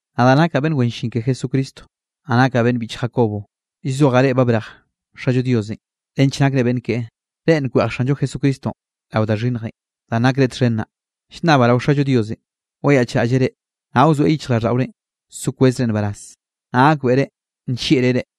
Nadaꞌ nakaꞌ beꞌnn wen llin ke Jesucristo, naꞌ nakaꞌ beꞌnn biꞌch Jacobo. Llzojaꞌ reꞌ ba brej Xallo Diosenꞌ nench nakre beꞌnn keꞌe, reꞌ nkweꞌj Xanllo Jesucristonꞌ rao da xhinnjenꞌ danꞌ nakreꞌ txhen naꞌ. Llnnabaꞌ rao Xallo Diosenꞌ wayaꞌchraꞌlleꞌ reꞌ, naꞌ wzoeꞌ yichjraꞌlldaꞌorenꞌ so kwezre nbaraz, naꞌ gakbeꞌre nllieꞌreꞌ reꞌ.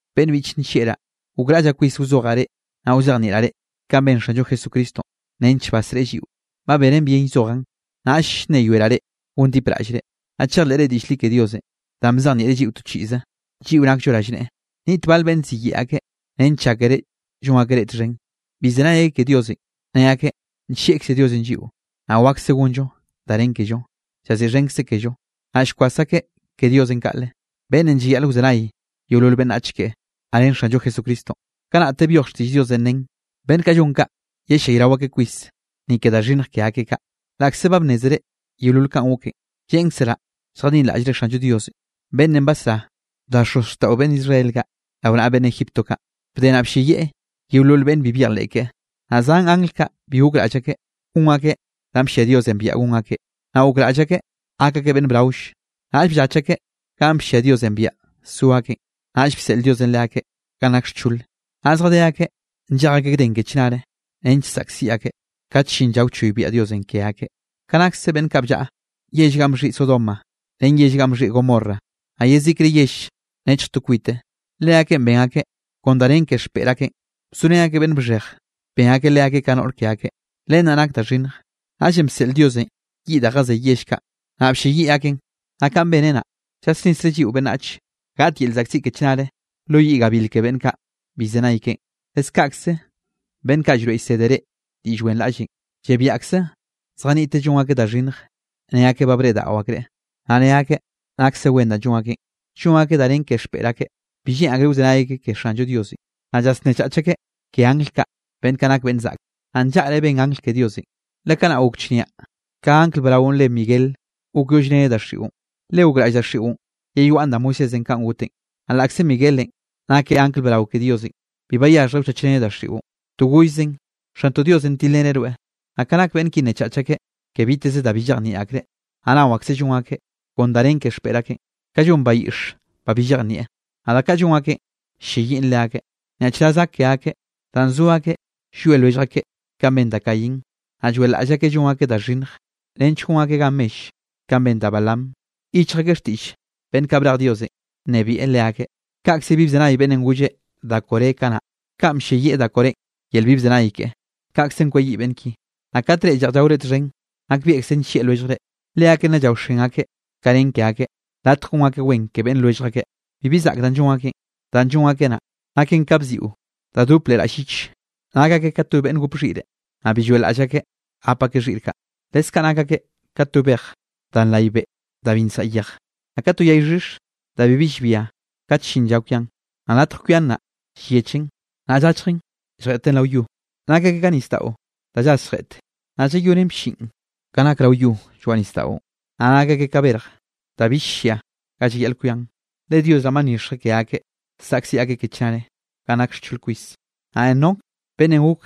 Beꞌnn biꞌche nllieꞌraꞌ, gokraꞌllaꞌ kwis wzojaꞌ reꞌ, naꞌ wzejnieꞌraꞌ reꞌ kanꞌ ben Xanllo Jesucristonꞌ nench basreꞌe lliꞌo. Ba benen bien llzojaꞌn, naꞌll llnneyoeraꞌ reꞌ gondipraꞌllre, naꞌ chejleꞌre diꞌll li ke Diosenꞌ da bzejnieꞌreꞌ lliꞌo to chiꞌze, lliꞌo nakllo rallneꞌe. Niꞌt bal beꞌnne ziyeꞌe akeꞌ nench llákere llon akeꞌ reꞌ txhen. Bi llzenay akeꞌ ke Diosenꞌ, ne akeꞌ nllieꞌkze Diosenꞌ lliꞌo, naꞌ wakse gonllo danꞌ nen kello, llaziꞌxhenkzeꞌ kello. Naꞌ llkwas akeꞌ ke Diosenꞌ kaꞌle, beꞌnnenꞌ llayaꞌl wzenay yeolol beꞌnnach keꞌe, naꞌ ren Xanllo Jesucristonꞌ. Kanaꞌte byoj xtiꞌll Diosenꞌ nen, beꞌnn kaꞌ llon kaꞌ yellayrao akeꞌ kwis, ni ke da xhinnj ke akeꞌ kaꞌ. Laꞌkze ba bnnézere yeolol kanꞌ goken, lleꞌnkzeraꞌ lljadinraꞌllre Xanllo Diosenꞌ beꞌnnenꞌ basrá da xozxtaꞌo beꞌnn Israel kaꞌ rao naꞌa beꞌnn Egipto kaꞌ, bde naꞌ blleyieꞌ yeolol beꞌnn bi byejleꞌ keꞌe. Naꞌ zan angl kaꞌ bi gokraꞌll akeꞌ gon akeꞌ danꞌ bllia Diosenꞌ biaꞌa gon akeꞌ, naꞌ gokraꞌll akeꞌ gak akeꞌ beꞌnn braoll. Naꞌll bllach akeꞌ ganꞌ bllia Diosenꞌ biaꞌa so akeꞌn. Naꞌll bseꞌl Diosenꞌ leakeꞌ ganꞌ nak xchole, naꞌ zjadé akeꞌ nllej akeꞌ gden ke chnare, nench saꞌkziꞌ akeꞌ kat llin lla wchoybiaꞌ Diosenꞌ ke akeꞌ. Ka nakse beꞌnn kaꞌ bllaꞌa yell ganꞌ bxhiꞌi Sodoma ren yell ganꞌ bxhiꞌi Gomorra, naꞌ yezikre yell nechj to kwite, leakeꞌn ben akeꞌ kon da nen ke xpeꞌr akeꞌn, bzorén akeꞌ beꞌnn bxhej, ben akeꞌ leakeꞌ ka no xhoꞌr akeꞌ. Len naꞌ nak da xhinnj, naꞌllenꞌ bseꞌl Diosenꞌ yiꞌ da jazey yell kaꞌ, naꞌ blleyiꞌ akeꞌn. Naꞌ kaꞌn beneꞌ naꞌ, llasnisreꞌ lliꞌo beꞌnnach gaꞌt yel llzaꞌkziꞌ ke chnare lo yiꞌ gabil ke beꞌnn kaꞌ bi llzenay keꞌen. Leskaꞌkze beꞌnn kaꞌ llroeꞌ llsede reꞌ diꞌll wenraꞌllenꞌ, llebiaꞌkze zjaniꞌte llon akeꞌ da xhinnj ne akeꞌ ba breꞌdaꞌo akreꞌ, naꞌ ne akeꞌ nakse wen danꞌ llon akeꞌn: llon akeꞌ da nen ke xpeꞌr akeꞌ, bi lleꞌn akreꞌ wzenay akeꞌ ke Xanllo Diosenꞌ, naꞌ llasnnechach akeꞌ ke angl kaꞌ, beꞌnn kaꞌ nak beꞌnn zaꞌke. Naꞌ nllaꞌre ben angl ke Diosenꞌ, le kanaꞌ gok chnia ka angl braonꞌ reꞌe Miguel gokyollreneꞌ daxiꞌon, le gokraꞌll daxiꞌon yeyoaꞌn da Moisésenꞌ kanꞌ goteꞌn. Naꞌ laꞌkze Miguelenꞌ nakeꞌ angl brao ke Diosenꞌ, bi bayaxhjreꞌ wchachreneꞌ daxiꞌon, to gollzeꞌn: “Xantoꞌ Diosenꞌ tilreneꞌ rweꞌ.” Naꞌ ka nak beꞌnn ki nnechach akeꞌ ke biteze da bi llejnieꞌ akreꞌ, naꞌ nao akseꞌ llon akeꞌ kon da nen ke xpeꞌr akeꞌn, ka llon bayiꞌx ba bi llejnieꞌ, naꞌ da kaꞌ llon akeꞌn ll-lleyiꞌn leakeꞌ. Nyaꞌchraz gak ke akeꞌ danꞌ zo akeꞌ llwie lwellj akeꞌ kanꞌ ben da Caín, naꞌ lloeꞌlaꞌll akeꞌ llon akeꞌ da xhinnj, nench gon akeꞌ gan mell kanꞌ ben da Balaam. Yichj akeꞌ xtiꞌll beꞌnn kaꞌ brej Diosenꞌ nnebieꞌ leakeꞌ, kaꞌkze bi bzenay beꞌnnenꞌ golle da Coré kanaꞌ. Kanꞌ blleyiꞌ da Corénꞌ yel bi bzenay keꞌe, kaꞌkzenꞌ kweyiꞌ beꞌnn ki. Naꞌ kate reꞌ lleꞌj llaore txhen, nakbieꞌkze nllieꞌ lwelljre, leakeꞌ naꞌ llaoxen akeꞌ ka nen ke akeꞌ, latj gon akeꞌ wen ke beꞌnn lwellj akeꞌ. Bibi zaꞌk danꞌ llon akeꞌn, danꞌ llon akeꞌ naꞌ, naken ka bziꞌo da dop leꞌ raꞌll lliche, nak akeꞌ ka to beꞌnn gop xhiꞌre, naꞌ bi lloeꞌlaꞌll akeꞌ gap akeꞌ xhiꞌr kaꞌ. Leskaꞌ nak akeꞌ ka to bej da nray beꞌ danꞌ bi nsaꞌa yej, naꞌ ka to yay xhix da bibi llbia kat ll-llin lla kwian, naꞌ latj kwian naꞌ, llyechen, naꞌ llachjen lljeꞌten rao yo. Nak akeꞌ ka nisdaꞌo da llas lletj, naꞌ llalloꞌnnen blliꞌn ga nak rao yo lloaꞌ nisdaꞌon. Naꞌ nak akeꞌ ka berj da bill llia ga llayaꞌl kwian, le Dios naꞌ ba nyixjeꞌ ke akeꞌ, saꞌkziꞌ akeꞌ ke chnare ganꞌ nak xchole kwis. Naꞌ Enoc beꞌnnenꞌ gok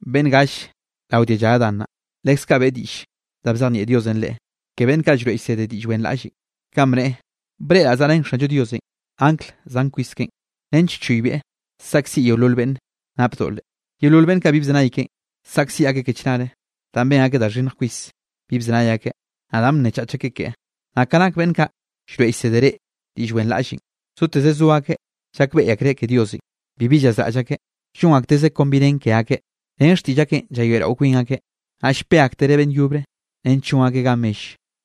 beꞌnn galle rao dialla Adán naꞌ, leskaꞌ beꞌe diꞌll da bzejnieꞌ Diosenꞌ leꞌe ke beꞌnn kaꞌ llroeꞌ llsede diꞌll wenraꞌlle, kanꞌ bneꞌe: “Breꞌraꞌ zaꞌrén Xanllo Diosenꞌ angl zan kwis keꞌen, nench choybieꞌ saꞌkziꞌ yeolol beꞌnn nap doꞌle. Yeolol beꞌnn kaꞌ bi bzenay keꞌen, saꞌkziꞌ akeꞌ ke chnare danꞌ ben akeꞌ da xhinnj kwis bi bzenay akeꞌ, naꞌ danꞌ bnnechach akeꞌ keꞌe.” Naꞌ ka nak beꞌnn kaꞌ llroeꞌ llsede reꞌ diꞌll wenraꞌllenꞌ, zoteze zo akeꞌ llakbeꞌy akreꞌ ke Diosenꞌ, bibi llazraꞌll akeꞌ. Llon aktezeꞌ kon bi nen ke akeꞌ. Ren xtiꞌll akeꞌn llayoeꞌrao kwin akeꞌ, naꞌ llpe aktereꞌ beꞌnn yobre nench llon akeꞌ gan mell.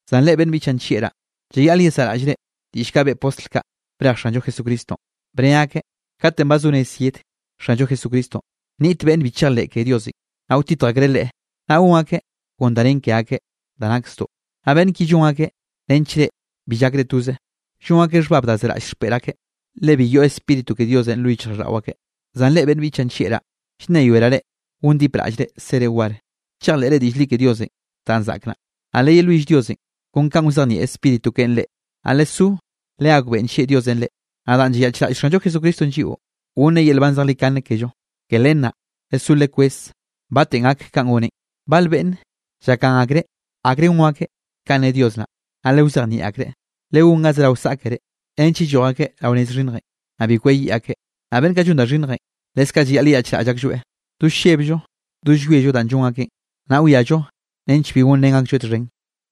Zan reꞌ beꞌnn biꞌchaꞌ nllieꞌraꞌ, llayaꞌl yesaꞌraꞌllre diꞌll kaꞌ beꞌe postl kaꞌ brej Xanllo Jesucristonꞌ. Bne akeꞌ: “Katenꞌ ba zo rez yed Xanllo Jesucristonꞌ, nniꞌt beꞌnn bi chejleꞌ ke Diosenꞌ, naꞌ wtitj akreꞌ Leꞌe, naꞌ gon akeꞌ kon da nen ke akeꞌ da nak zdoꞌ.” Naꞌ beꞌnn ki llon akeꞌ nench reꞌ bi llak reꞌ toze. Llon akeꞌ xhbab da zeraꞌll xpeꞌr akeꞌ, le bi yoꞌ Spíritu ke Diosenꞌ lo yichjraꞌlldaꞌo akeꞌ. Zan reꞌ beꞌnn biꞌchaꞌ nllieꞌraꞌ, llnneyoeraꞌ reꞌ gondipraꞌllre sere war, chejleꞌre diꞌll li ke Diosenꞌ danꞌ zaꞌk naꞌ. Naꞌ leyelwill Diosenꞌ kon kanꞌ wzejnieꞌ Spíritu keꞌen reꞌ. Naꞌ lesó legakbeꞌe nllieꞌ Diosenꞌ reꞌ. Naꞌ danꞌ llayaꞌchraꞌll Xanllo Jesucristonꞌ lliꞌo, gonneꞌ yel nban zejlikane kello. Ke len naꞌ lesó lekweze batenꞌ gak kanꞌ goneꞌn. Bal beꞌnne llakgan akreꞌ akrenꞌ gon akeꞌ kanꞌ ne Dios naꞌ, naꞌ lewzejnieꞌ akreꞌ. Legón ga zerao saꞌkere nench yelloj akeꞌ rao nez xhinnjenꞌ, naꞌ bi kweyiꞌ akeꞌ. Naꞌ beꞌnn kaꞌ llon da xhinnjenꞌ, leskaꞌ llayaꞌl yeyaꞌchraꞌll aklloeꞌ, do llebllo do llwiello danꞌ llon akeꞌn, naꞌ wiallo nench bi gonrén aklloeꞌ txhen.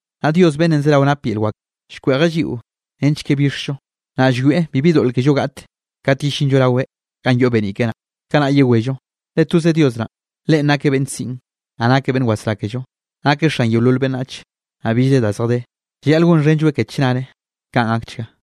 Naꞌ Dios beꞌnnenꞌ zerao nap yel wak, llkweꞌjeꞌ lliꞌo nench ke bixllo, naꞌ llwieꞌ bibi doꞌl kello gaꞌt kat yellinllo raweꞌ ganꞌ yoꞌ beniꞌ keꞌe naꞌ. Kanaꞌ yewello. Le toze Dios naꞌn, Leꞌen nakeꞌ beꞌnn siꞌn, naꞌ nakeꞌ beꞌnn wasrá kello. Nakeꞌ xan yeolol beꞌnnach, naꞌ billre da zjadé. Llayaꞌl gonxhenlloeꞌ ke chnare. Kaꞌn gakchga.